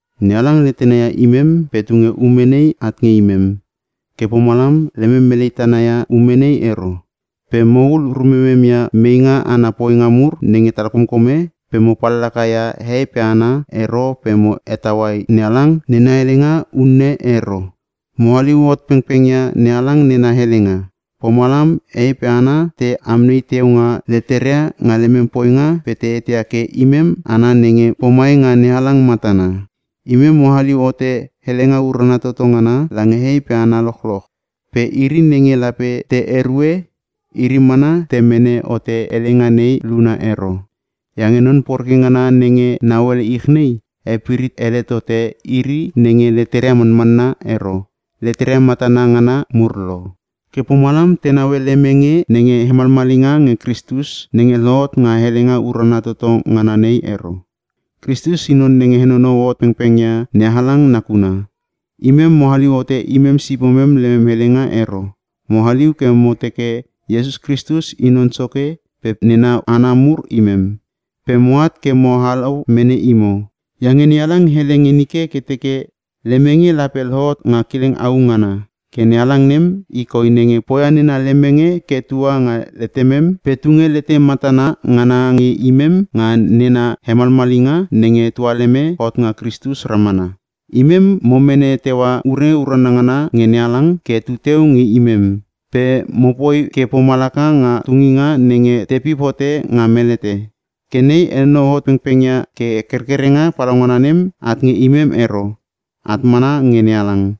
NeHalang letena ia imem pe tunge ume nei at nge imem. Ke pomalam lemem melei tana ia ume nei ero. Pe mohul rumemem ia meinga ana poinga mur nenge talkomkome pe mo pallaka ia hehei pe hana ero pe mo hetaua NeHalang nena helenga unne e ero. Mo haliu hot pengpeng ia NeHalang nena helenga. Pomalam hehei pe hana te amnei teu nga leteria nga lemem poinga pe te eteia ke imem hana nenge pomai nga NeHalang matana. Imem mo haliu hote helenga urana toto ngana lange hehei pe hana lochloch, pe iri nenge lape te erue, iri mana te mene hote helenga nei luna ero. Iange non poreke ngana nenge nauele ich nei, hepirit ele tote iri nenge leteria manmanna ero, leteria matana ngana mur lo. Ke pomalam te naue lemenge nenga hemalmalinga nge Kristus nenge lohot nga helenga urana toto ngana nei ero. Kristus i non nenge henonou hot pengpeng ia NeHalang nakuna. Imem mo haliu hote imem sipomem lemem helenga ero. Mo haliu ke mo teke Iesus Kristus i Non Soke pe nena hana mur imem, pe moat ke mo halau mene imo. Iange NeHalang hele nge nike ke teke, “Lemenge lape lohot nga kileng au ngana!” Ke NeHalang nem, i koi nenge poia nena lemenge ke tua nga letemem pe tunge lete matana ngana nge imem nga nena hemalmalinga, nenge tualeme hot nga Kristus ramana. Imem mo mene teua ure urana ngana nge NeHalang ke tuteu nge imem. Pe mo poike pomalaka nga tuninga nenge tepip hote nga melete. Ke nei henonou hot pengpeng ia ke kerkerenga palaungana nem at nge imem ero, at mana nge Nehalang.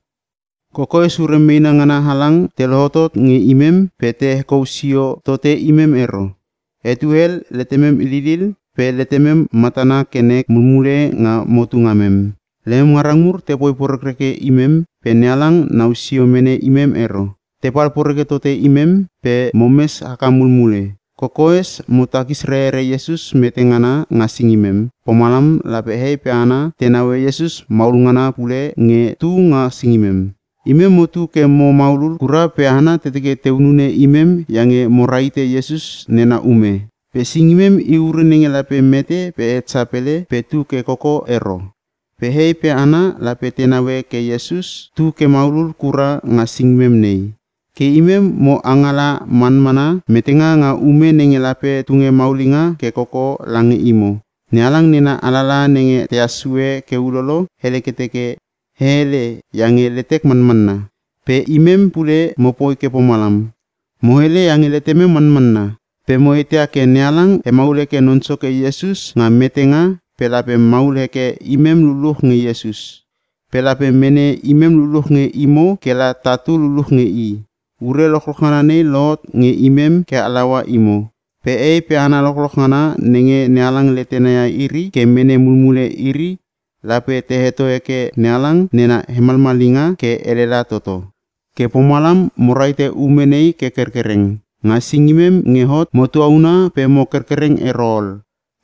Kokoes ure meena ngana halang te lohotot nge imem pe te hekou sio tote imem ero. Etue hel letemem lilil pe letemem matana ke nek mulmule nga motu ngamem. Lemem ngarang mur tepoi porekreke imem pe NeHalang nausio mene imem ero. Tepal poreke totote imem pe momes haka mulmule. Kokoes mo takis rerere Iesus mete ngana nga singimem, pomalam lape hehei pe hana te naue Iesus maulngana pule nge tu nga singimem. Imem motu ke mo maulul kura pe hana te teke te hunune imem iange mo rahite Iesus nena ume. Pe singimem i ure nenge lape mete pe het sapele pe tu ke koko ero. Pe hehei pe hana lape te naue ke Iesus tu ke maulul kura nga singimem nei. Ke imem mo angala manmana metenga nga ume nenge lape tunge maulinga ke koko lange imo. NeHalang nena alalaha nenge tehas sue ke ulolo, hele ke teke, “E hele, iange letek manmanna.” Pe imem pule mopoi ke pomalam. Mo hele iange letemem manmanna. Pe mo eteia ke NeHalang hemaul heke Non Soke Iesus nga metenga pe lape hemaul heke imem luluch nge Iesus. Pe lape mene imem luluch nge imo ke la tatu luluch nge i. Ure lochloch ngana nei lohot nge imem ke halaua imo. Pe hehei pe hana lochloch ngana nenge NeHalang letena ia iri ke mene mulmule iri, lape te heto heke NeHalang nena hemalmalinga ke elela toto. Ke pomalam mo rahite ume nei ke kerkereng. Nga singimem nge hot mo tuauna pe mo kerkereng ero ol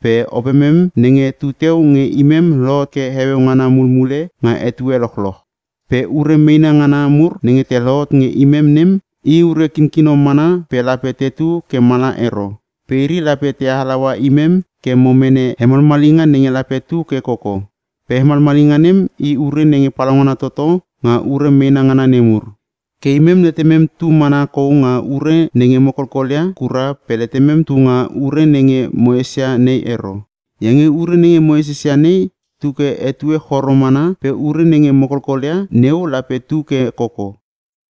pe opemem nenge tuteu nge imem lohot ke heueu ngana mulmule nga etue lochloch. Pe ure meena ngana mur nenge te lohotot nge imem nem, i ure kinkino mana pe lape tetu ke mala ero. Pe iri lape te halaua imem ke mo mene hemalmalinga nenge lape tu ke koko. Pe hemalmalinga nem i ure nenge palaungana toto nga ure meena ngana nemur. Ke imem letemem tu mana kou nga ure nenge mo kolkol ia kura pe letemem tunga ure nenge mo esesia nei ero. Iange ure nenge mo esesia nei tu ke etue choro mana pe ure nenge mo kolkol ia neu lape tu ke koko.